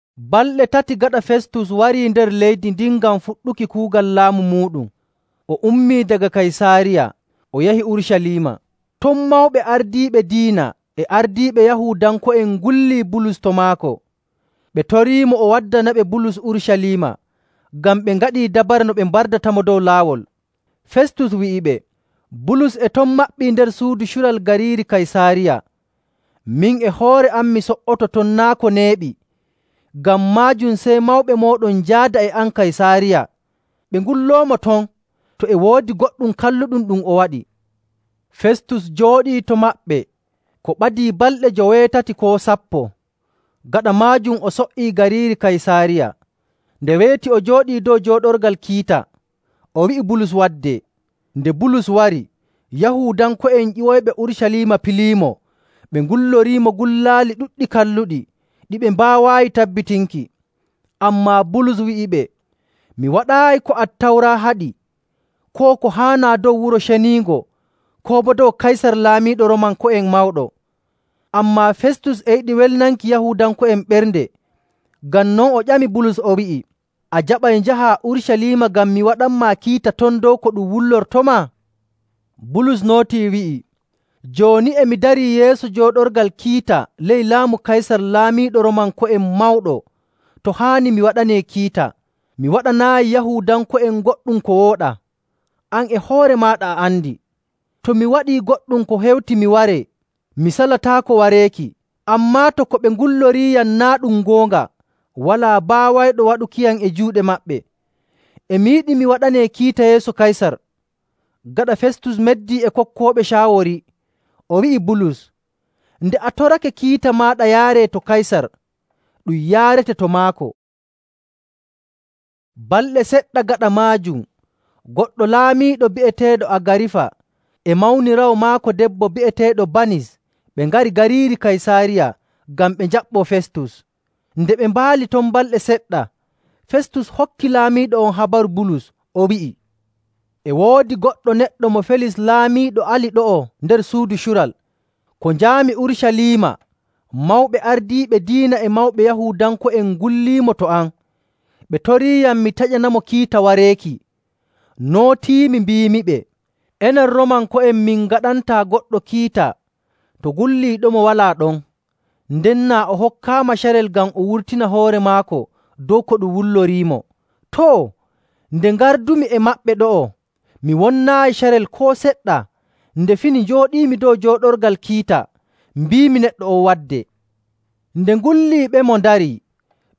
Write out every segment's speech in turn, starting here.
Balɗe tati gaɗa Festus warii nder leydi ndin ngam fuɗɗuki kuugal laamu muuɗum, o ummii daga Kaysaariya, o yahi Urucaliima. Ton mawɓe ardiiɓe diina e ardiiɓe Yahuudanko'en ngullii Bulus to maako. Ɓe toriimo o waddanaɓe Bulus Urucaliima, ngam ɓe ngaɗii dabare no ɓe mbardatamo dow laawol. Festus wi'iɓe, “Bulus e ton maɓɓii nder suudu cural gariiri Kaysaariya. Min e hoore am mi so''oto ton naa' ko neeɓi. Ngam maajum, sey mawɓe mooɗon njaada e am Kaysaariya, ɓe ngulloomo ton to e woodi goɗɗum kalluɗum ɗum o waɗi.” Festus jooɗii to maɓɓe ko ɓadii balɗe joweetati koo sappo. Gaɗa maajum o so''ii gariiri Kaysaariya. Nde weeti, o jooɗii dow jooɗorgal kiita, o wi'i Bulus waddee. Nde Bulus wari, Yahuudanko'en ƴiwoyɓe Urucaliima piliimo, ɓe ngulloriimo gullaali ɗuɗɗi kalluɗi, ɗi ɓe mbaawaayi tabbitinki. Ammaa Bulus wi'iɓe, “Mi waɗaayi ko Attawra haɗi, koo ko haanaa dow Wuro Ceniingo, koo boo dow Kaysar laamiiɗo Roomanko'en mawɗo.” Ammaa Festus e yiɗi welnanki Yahuudanko'en ɓernde, ngam non o ƴami Bulus, o wi'i, “A jaɓay njahaa Urucaliima ngam mi waɗanmaa kiita ton dow ko ɗum wullortomaa?” Bulus nootii, wi'i, “Jooni e mi darii yeeso jooɗorgal kiita ley laamu Kaysar laamiiɗo Roomanko'en mawɗo to haani mi waɗanee kiita. Mi waɗanaayi Yahuudanko'en goɗɗum ko wooɗaa. An e hoore maaɗa a andi. To mi waɗii goɗɗum ko hewti mi waree, mi salataako wareeki. Ammaa to ko ɓe ngulloriiyam naa' ɗum goonga, walaa baawayɗo waɗukiyam e juuɗe maɓɓe. E mi yiɗi mi waɗanee kiita yeeso Kaysar!” Gaɗa Festus meddii e kokkooɓemo caawori, o wi'i Bulus, “Nde a torake kiita maaɗa yaaree to Kaysar, ɗum yaarete to maako!” Balɗe seɗɗa gaɗa maajum, goɗɗo laamiiɗo bi'eteeɗo Agarifa e mawniraawo maako debbo bi'eteeɗo Banis ɓe ngari gariiri Kaysaariya ngam ɓe njaɓɓoo Festus. Nde ɓe mbaali ton balɗe seɗɗa, Festus hokki laamiiɗo on habaru Bulus, o wi'i, “E woodi goɗɗo neɗɗo mo Felis laamiiɗo ali ɗo'o nder suudu cural. Ko njaami Urucaliima, mawɓe ardiiɓe diina e mawɓe Yahuudanko'en ngulliimo to am, ɓe toriiyam mi taƴanamo kiita wareeki. Nootiimi, mbiimiɓe, enen Roomanko'en en ngaɗantaa goɗɗo kiita to gulliiɗomo walaa ɗon, nden naa' o hokkaama carel ngam o wurtina hoore maako dow ko ɗum wulloriimo. Too, nde ngardumi e maɓɓe ɗo'o, mi wonnaayi carel koo seɗɗa. Nde fini njooɗiimi dow jooɗorgal kiita, mbiimi neɗɗo on waddee. Nde gulliiɓemo ndarii,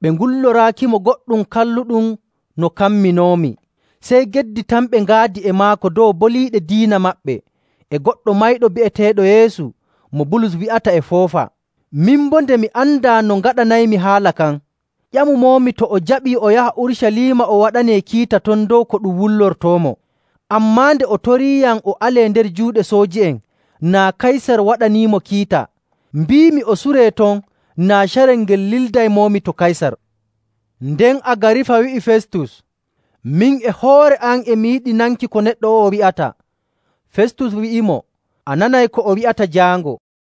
ɓe ngulloraakimo goɗɗum kalluɗum no kamminoomi. Sey geddi tan ɓe ngaadi e maako dow boliiɗe diina maɓɓe, e goɗɗo mayɗo bi'eteeɗo Yeesu, mo Bulus wi'ata e foofa. Min boo, nde mi andaa no ngaɗanaymi haala kan, ƴamumoomi to o jaɓii o yaha Urucaliima o waɗanee kiita ton dow ko ɗum wullortoomo. Ammaa nde o toriiyam o alee nder juuɗe sooji'en naa Kaysar waɗaniimo kiita, mbiimi o suree ton naa carel ngel lildaymoomi to Kaysar.” Nden Agarifa wi'i Festus, “Min e hoore am, e mi yiɗi nanki ko neɗɗo o'o wi'ata.” Festus wi'imo, “A nanay ko o wi'ata jaango.”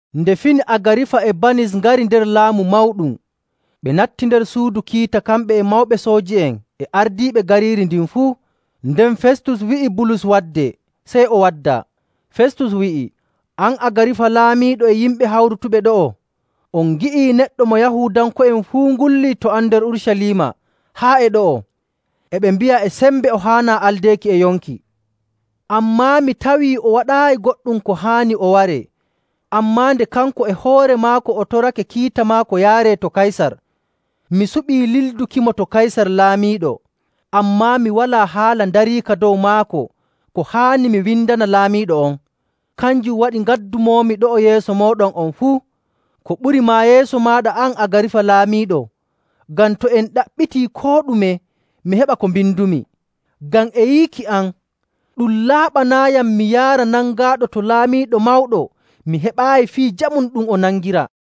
Nde fini Agarifa e Banis ngari nder laamu mawɗum, ɓe natti nder suudu kiita, kamɓe e mawɓe sooji'en e ardiiɓe gariiri ndin fuu. Nden Festus wi'i Bulus waddee, sey o waddaa. Festus wi'i, “An Agarifa laamiiɗo e yimɓe hawrutuɓe ɗo'o! On ngi'ii neɗɗo mo Yahuudanko'en fuu ngullii to am nder Urucaliima haa e ɗo'o, e ɓe mbi'a e sembe o haanaa aldeeki e yonki. Ammaa mi tawii o waɗaayi goɗɗum ko haani o waree. Ammaa nde kanko e hoore maako o torake kiita maako yaaree to Kaysar, mi suɓii lildukimo to Kaysar Laamiiɗo. Ammaa mi walaa haala ndariika dow maako ko haani mi windana laamiiɗo on. Kanjum waɗi ngaddumoomi ɗo'o yeeso mooɗon on fuu, ko ɓuri maa yeeso maaɗa an, Agarifa laamiiɗo, ngam to en ɗaɓɓitii koo ɗume mi heɓa ko mbindumi. Ngam e yiiki am, ɗum laaɓanaayam mi yaara nangaaɗo to Laamiiɗo Mawɗo, mi heɓaayi fii jamum ɗum o nangiraa.”